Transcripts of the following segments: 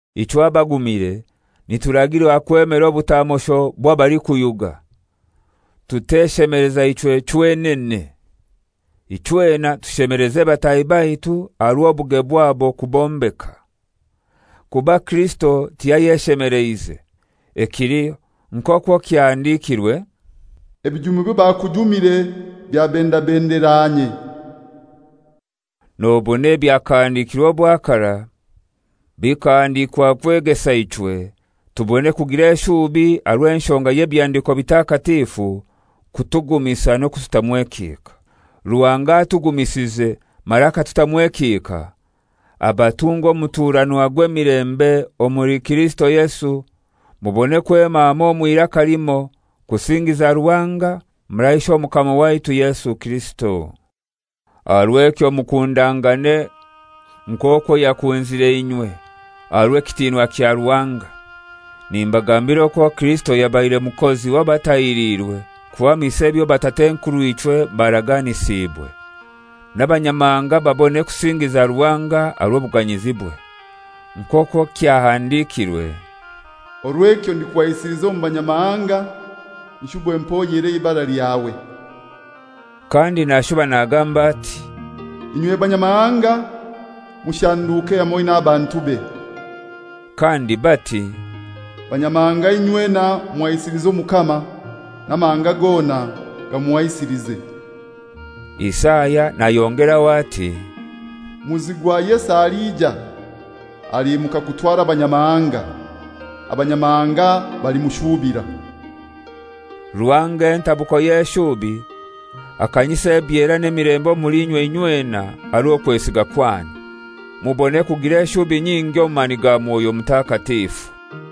Ichwe abagumire nituragirwa kwemera obutamosho bw'abalikuyuga, tuteshemeleza ichwe chwenane. Ichwena tushemeleze bataahi baitu aha rw'obuge bwabo kubombeka. Kuba Kirisito tiyayeshemeleize. Ekiliho nk'okwo kyahandikirwe, «Ebijumi by'abakujumire byabendabendera inye.» Nobona ebyakahandikirwe obwa karai bikahandikwa kwegesa ichwe tubone kugira eshubi aha rw'enshonga y'Ebihandiko Bitakatifu kutugumisa n'okututamu ekihika. Ruhanga atugumisize mara akatutamu ekihika abatunge omuturanwa gw'emilembe omuli Kirisito Yesu, mubone kwema hamoi omw'iraka limoi kusingiza Ruhanga mara Ishe Omukama waitu Yesu Kirisito. Aha rw'ekyo mukundangane nk'okwo yakunzire inywe, aha rw'ekitinwa kya Ruhanga. Nimbagambira okwo Kirisito yabaire mukozi w'abatahiriirwe kuhamisa ebyo batat'enkurw'ichwe baraganisiibwe, n'Abanyamahanga babone kusingiza Ruhanga aha rw'obuganyizibwe. Nk'okwo kyahandikirwe, «Orw'ekyo ndikuhaisiliza omu Banyamahanga, nshube mpoyere eibara lyawe;» kandi nashuba nagamba ati, «Inywe Banyamahanga, mushanduke hamoi n'abantube;» kandi bati, «Banyamahanga inywena muhaisilize Omukama, n'amahanga gona gamuhaisilize.» Isaya nayongeraho ati, «Muzi gwa Yese aliija, aliimuka kutwara Abanyamahanga: Abanyamahanga balimushuubira.» Ruhanga, entabuko y'eshubi akanyise ebyera n'emilembe omuli inywe inywena aha rw'okwesiga kwanyu, mubone kugira eshubi nyingi omu mani ga Mwoyo Mutakatifu.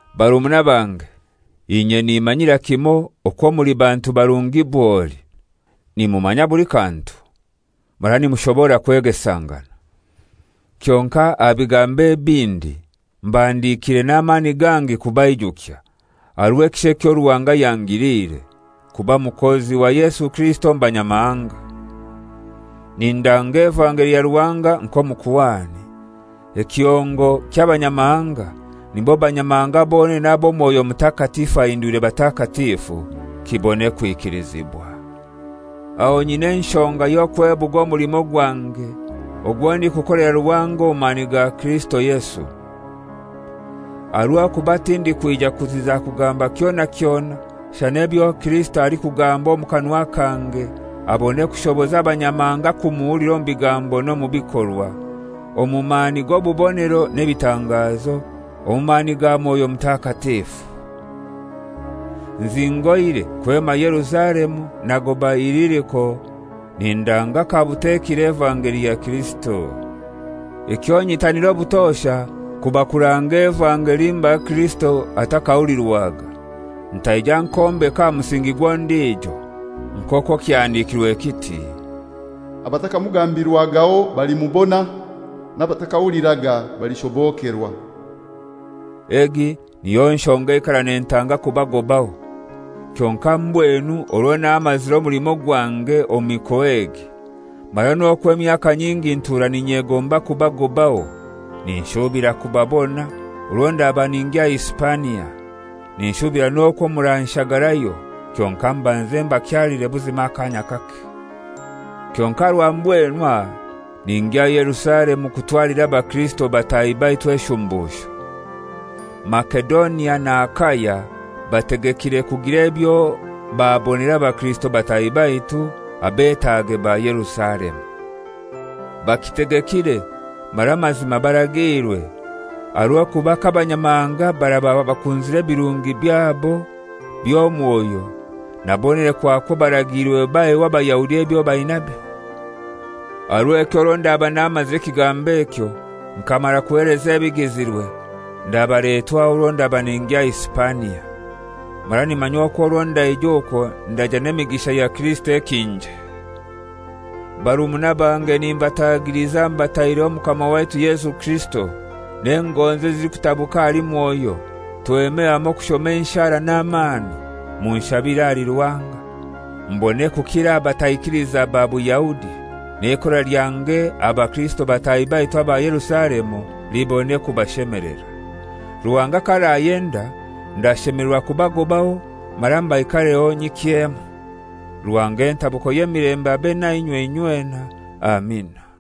Barumuna bange, inye nimanyira kimoi okwo muli bantu barungi bwoli, nimumanya buli kantu mara nimushobokerwa kwegesangana. Kyonkai aha bigambo ebindi mbahandikiire n'amani gangi kubaijukya, aha rw'ekisha ekyo Ruhanga yangiliire, kuba mukozi wa Yesu Kirisito omu Banyamahanga. Nindanga evangeli ya Ruhanga nk'omukuhani, ekihongo ky'Abanyamahanga, nibo Banyamahanga bonene abo Mwoyo Mutakatifu ahindwire batakatifu, kibone kwikilizibwa. Aho nyina enshonga y'okwebuga omulimo gwange ogwo ndikukolera Ruhanga omu mani ga Kirisito Yesu. Aha rw'okuba tindikwija kuziza kugamba kyona kyona shana ebyo Kirisito alikugamba omu kanwa kange, abone kushoboza Abanyamahanga kumuhulira omu bigambo n'omu bikorwa, omu mani g'obubonero n'ebitangazo, omu mani ga Mwoyo Mutakatifu. Nzingoire kwema Yerusalemu nagoba Iliriko, nindanga kabutekire evangeli ya Kirisito. Ekyo nyitanira obutosha kuba kuranga evangeli mbali Kirisito atakahulirwaga, ntaija nkombeka aha musingi gw'ondijo. Nk'okwo kyahandikirwe kiti, «Abatakamugambirwagaho balimubona, n'abatakahuliraga balishobokerwa.» Egi niyo nshonga eikara nentanga kubagobaho. Kyonkai mbwenu orwo namazire omulimo gwange omu mikoa egi, mara n'okwo emyaka nyingi ntura n'inyegomba kubagobaho, ninshubira kubabona orwo ndaba ningya Hisipania, ninshubira n'okwo muranshagarayo, kyonkai mbanze mbakyalire buzima akaanya kake. Kyonkai aha rwa mbwenu aha ningya Yerusalemu kutwalira abakirisito bataahi baitu eshumbusho. Masedonia na Akaya bategekire kugira ebyo babonera abakirisito bataahi baitu abetaage ba Yerusalemu. Bakitegekire, mara mazima baragiirwe, aha rw'okuba k'Abanyamahanga baraba bakunzire ebirungi byabo by'omwoyo, na bonene kwakwo baragiirwe baheho Abayahudi ebyo bainabyo. Aha rw'ekyo orwo ndaba namazire ekigambo ekyo, nkamara kuheleza ebigizirwe, ndabaletwaho orwo ndaba ningya Hisipania. Mara nimanya okwo orwo ndaija okwo ndaija n'emigisha ya Kirisito ekinje. Barumuna bange nimbatagiliza mbataireho Omukama waitu Yesu Kirisito n'engonzi ezilikutabuka ahali Mwoyo, tweme hamoi kushoma enshara n'amani, munshabire ahali Ruhanga, mbone kukira aha bataikiliza ba Buyahudi, n'eikora lyange aha bakirisito bataahi baitu aba Yerusalemu libone kubashemelera. Ruhanga k'arayenda ndashemelerwa kubagobaho mara mbaikareho nyikyemu. Ruhanga entabuko y'emilembe abe nainywe inywena. Amina.